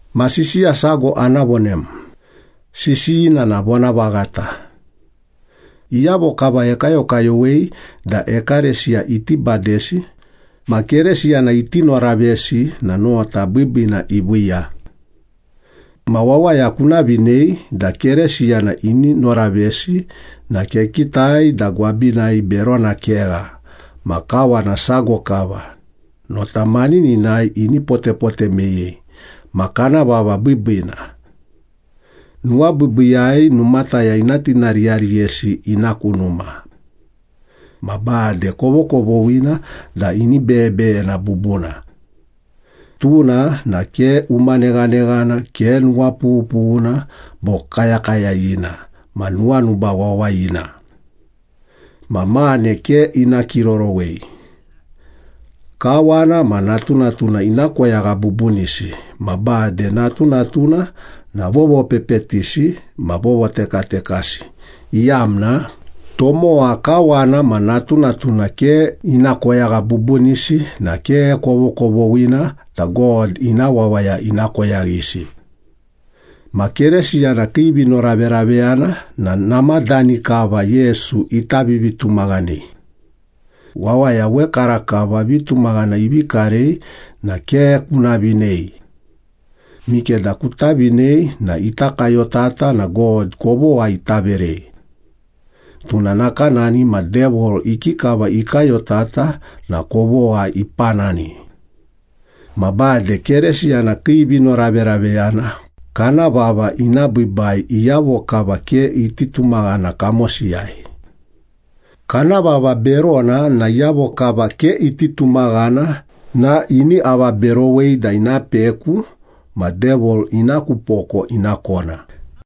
Ma sisiya sago ana vonem, sisiyina na vonavaghata. Iyavo kava ekayokayowei da ekalesiya iti badesi, ma Keresiyana iti noravesi na nota biibiina iviiya. Ma wawaya kuna vinei da Keresiyana ini noravesi na kekitai da gwabinai berona kegha, ma kawana sago kava, nota manininai ini potepote meyei, ma kana vava biibiina. Nuwabiibiiyai numataya ina tinariyariyesi ina ku numa. Ma bade kovokovoghina da ini beyebeyena bubuna. Tuna na ke umaneghaneghana, ke nuwapughupughuna bo kayakayayina ma nuwanuba wawayina. Ma mane ke ina kirorowei. Kawana ma natunatuna ina koyagha bubunisi, ma bade natunatuna na vovopepetisi ma vovotekatekasi, iyamna tomowa kawana ma natunatuna ke ina koyagha bubunisi na ke kovokovoghina da God ina wawaya ina koyaghisi. Ma Keresiyana kii vinoraveraveyana na namadani kava Yesu ita vivitumaghanei. Wawaya wekarakava vitumaghana ivi karei na ke kuna vinei. Mikeda kuta vinei na ita kayotata na God kovogha ita verei. Tuna nakanani ma Devil ikikava ikayotata na kovogha ipanani. Ma bade Keresiyana kii vinoraveraveyana kana vava ina biibai iyavo kava ke iti tumaghana kamosiyai. Kana vava berona na iyavo kava ke iti tumaghana na ini avaberowei da ina peku ma Devil ina ku poko ina kona.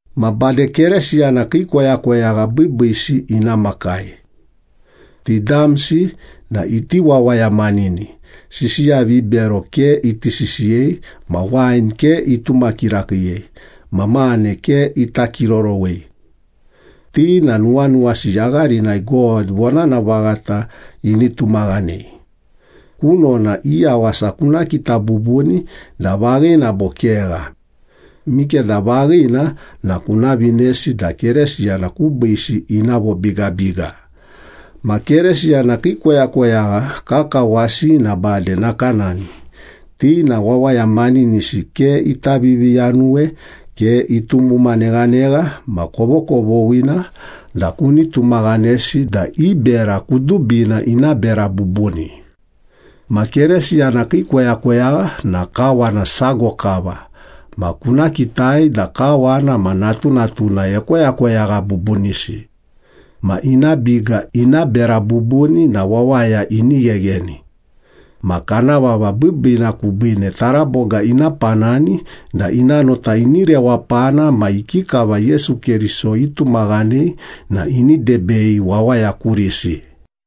Ma bade Keresiyana kii koyakoyagha biibiisi ina makai. Ti damsi na iti wawaya manini, sisiya vibero ke iti sisiyei, ma wain ke ituma kirakiiyei, ma mane ke ita kirorowei. Ti na nuwanuwasi yagharinai God vonana vaghata ini tumaghanei. Kunona i yawasa kuna kita bubuni da vaghina bo kegha. Mikeda vaghina na kuna vinesi da Keresiyana kubiisi ina vobigabiga. Ma Keresiyana kii koyakoyagha kakawasi na bade nakanani, ti na wawaya maninisi, ke ita viviyanuwe, ke itumuma neghanegha, ma kovokovoghina da kuni tumaghanesi da i bera kudubina ina bera bubuni. Ma Keresiyana kii koyakoyagha na kawana sago kava ma kuna kitai da kawana ma natunatuna ekoyakoyagha bubunisi. Ma ina biga ina bera bubuni na wawaya ini ghegheni. Ma kana vava biibiina kubiine taraboga ina panani da ina nota ini rewapana ma ikikava Yesu Keriso itumaghanei na ini debei wawaya kurisi.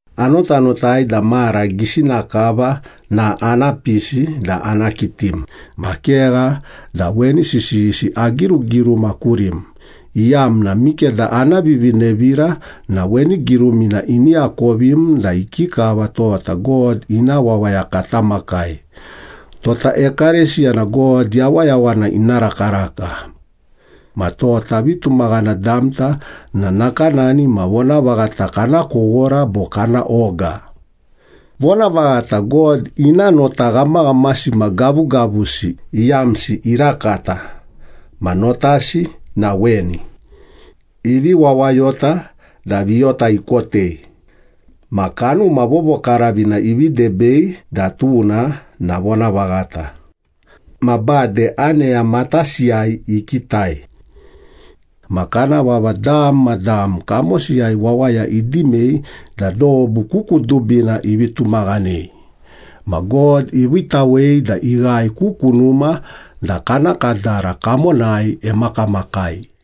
Anotanotai da mara gisina kava na ana pisi da ana kitim, ma kegha da weni sisiyisi agirugiruma kurim, iyamna mikeda ana vivinevira na weni girumina ini akovim da ikikava tota God ina wawaya kata makai, tota ekalesiya na God yawayawana ina rakaraka. Ma tota vitumaghana damta na nakanani ma vonavaghata kana kowora bo kana oga. Vonavaghata, God ina nota ghamaghamasi ma gavugavusi iyamsi irakata, ma notasi na weni. Ivi wawayota da viyota ikotei, Ma Kanuma Vovokaravina ivi debei da tuna na vonavaghata, Ma bade aneya matasiyai ikitai. Ma kana vava dam ma dam kamosiyai wawaya idimei, da dobu ku kudubina ivi tumaghanei, ma God iviitawei da ighae ku kunuma da kana kadara kamonai emakamakai.